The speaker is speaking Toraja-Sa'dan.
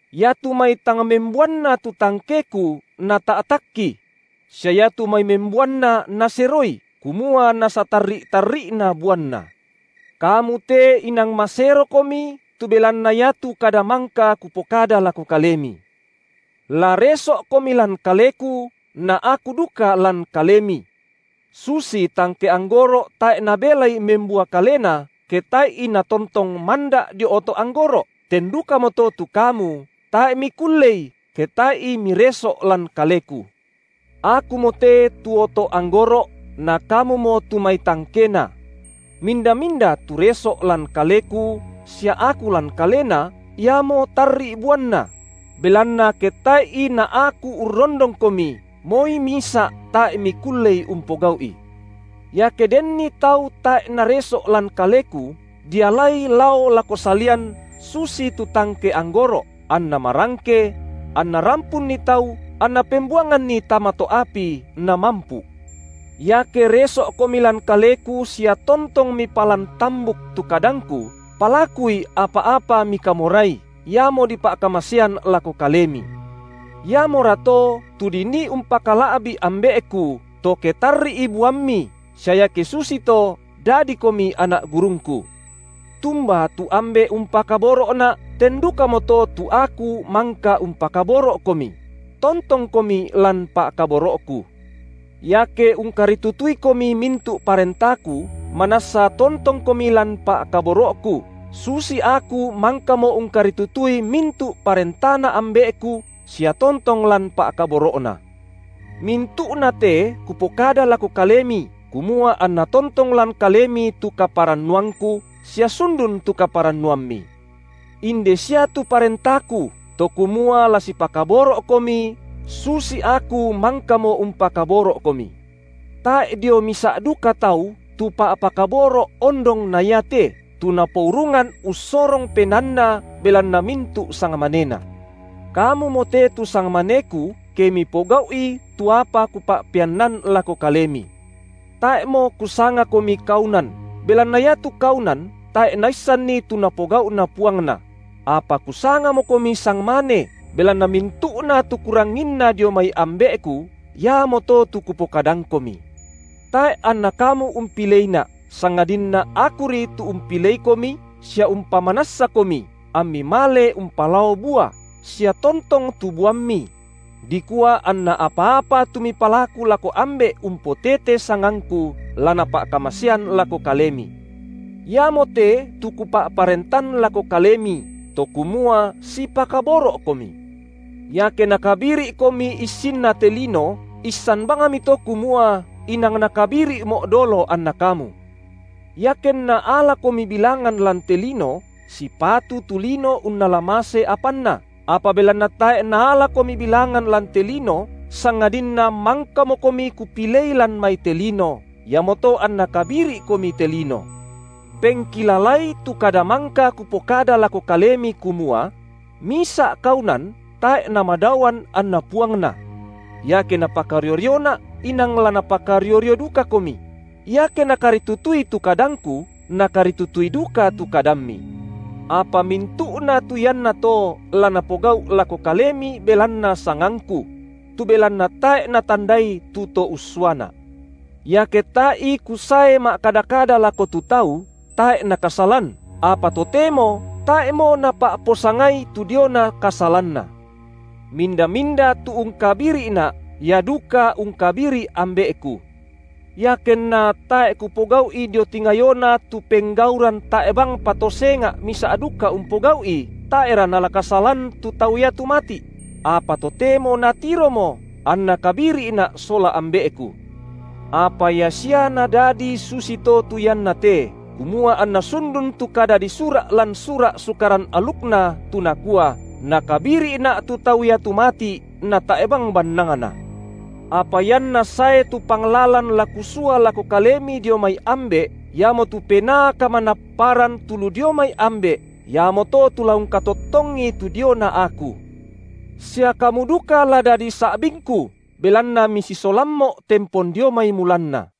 Iatu mai tang membuanna tu tangkeKu Nata’takki; sia iatu mai membuanna Naseroi, kumua nasatarri’-tarri’na buanna. Kamu te inang maserokomi tu belanna iatu kada mangka Kupokada lako kalemi. La reso’komi lan Kaleku, na Aku duka lan kalemi. Susi tangke anggoro’ tae’ nabelai membua kalena, ke tae’i natontong manda’ dio oto’ anggoro’, ten dukamoto tu kamu, tae’ mikullei, ketae’i mireso’ lan Kaleku. Akumote tu oto’ anggoro’, na kamumo tu mai tangkena. Minda-minda tu reso’ lan Kaleku, sia Aku lan kalena, iamo tarri’ buanna; belanna ke tae’i na Aku urrondongkomi moi misa’ tae’mikullei umpogau’i. Iake denni tau tae’ nareso’ lan Kaleku, dialai lao lako salian susitu tangke anggoro’, anna marangke; anna rampunni tau, anna pembuanganni tama to’ api, namampu’. Iake reso’komi lan Kaleku sia tontong mipalan tambuk tu kadangKu, palakui, apa-apa mikamorai, iamo dipa’kamasean lako kalemi. Iamorato tu dinii umpakala’bi’ Ambe’Ku, to ke tarri’i buammi, sia iake susito dadikomi anak gurungKu. Tumba tu Ambe’ umpakaboro’Na’, ten dukamoto tu Aku mangka umpakaboro’komi; tontongkomi lan pa’kaboro’Ku. Iake ungkaritutuikomi mintu’ parentaKu, manassa tontongkomi lan pa’kaboro’Ku, susi Aku mangkamo ungkaritutui mintu’ parentaNa Ambe’Ku sia tontong lan pa’kaboro’Na. Mintu’nate Kupokada lako kalemi, kumua anna tontong lan kalemi tu kaparannuangKu, sia sundun tu kaparannuammi. Inde sia tu parentaKu, to kumua la sipakaboro’komi susi Aku mangkamo umpakaboro’komi. Tae’ dio misa’ duka tau tu pa’pakaboro’ ondong na iate, tu napourungan ussorong penaanna belanna mintu’ sangmanena. Kamumo te tu sangmaneKu, ke mipogau’i tu apa Kupa’peannan lako kalemi. Tae’mo Kusangakomi kaunan, belanna iatu kaunan tae’ naissanni tu napogau’na puangna; apa Kusangamokomi sangmane, belanna mintu’na tu Kuranginna dio mai Ambe’Ku, iamoto tu Kupokadangkomi. Tae’ anNa kamu umpileiNa’, sangadinna Akuri tu umpileikomi sia umpamanassakomi, ammi male umpalao bua, sia tontong tu buammi; dikua anna apa-apa tu mipalaku lako Ambe’ umpotete sangangKu, la Napa’kamasean lako kalemi. Iamote tu Kupa’parentan lako kalemi, to kumua sipakaboro’komi. Iake nakabiri’komi issinna te lino, issan bangmito kumua inang nakabiri’Mo’ dolo anna kamu. Iakenna alakomi bilangan lan te lino, sipatu tu lino unnala mase apanna, apa belanna tae’ naalakomi bilangan lan te lino, sangadinna mangkamokomi Kupilei lan mai te lino, iamoto anna kabiri’komi te lino. Pengkilalai tu kada mangka Kupokada lako kalemi kumua: Misa’ kaunan tae’ namadaoan anna puangna. Iake napakario-rioNa’, inang la napakario-rio dukakomi; iake nakaritutui tu kadangKu, nakaritutui duka tu kadammi. Apa mintu’na tu iannato la napogau’ lako kalemi belanna sangangKu; tu belanna tae’ natandai tu To ussuaNa’. Iake tae’i Kusae ma’kada-kada lako tu tau, tae’ nakasalan, apa totemo tae’mo napa’posangai tu diona kasalanna. Minda-minda tu ungkabiri’Na’, ia duka ungkabiri’ Ambe’Ku. Iakenna tae’ Kupogau’i dio tingayona tu penggauran tae’ bangpa to senga’ misa’ duka umpogau’i tae’ra nala kasalan tu tau iatu mati’; apa totemo natiromo, anna kabiri’Na’ sola Ambe’Ku. Apa ia sia nadadi susito tu ianna te, kumua anna sundun tu kada disura’ lan Sura’ Sukaran alukNa, tu nakua: Nakabiri’Na’ tu tau iatu mati’ natae’ bang bannangna. Apa ianna sae tu Panglalan la Kusua lako kalemi dio mai Ambe’, iamotu Penaa Kamanapparan tu lu dio mai Ambe’, iamoto tu la ungkatottongi tu diona Aku. Sia kamu duka la dadi sa’bingKu, belanna misisolamMo’ tempon dio mai mulanna.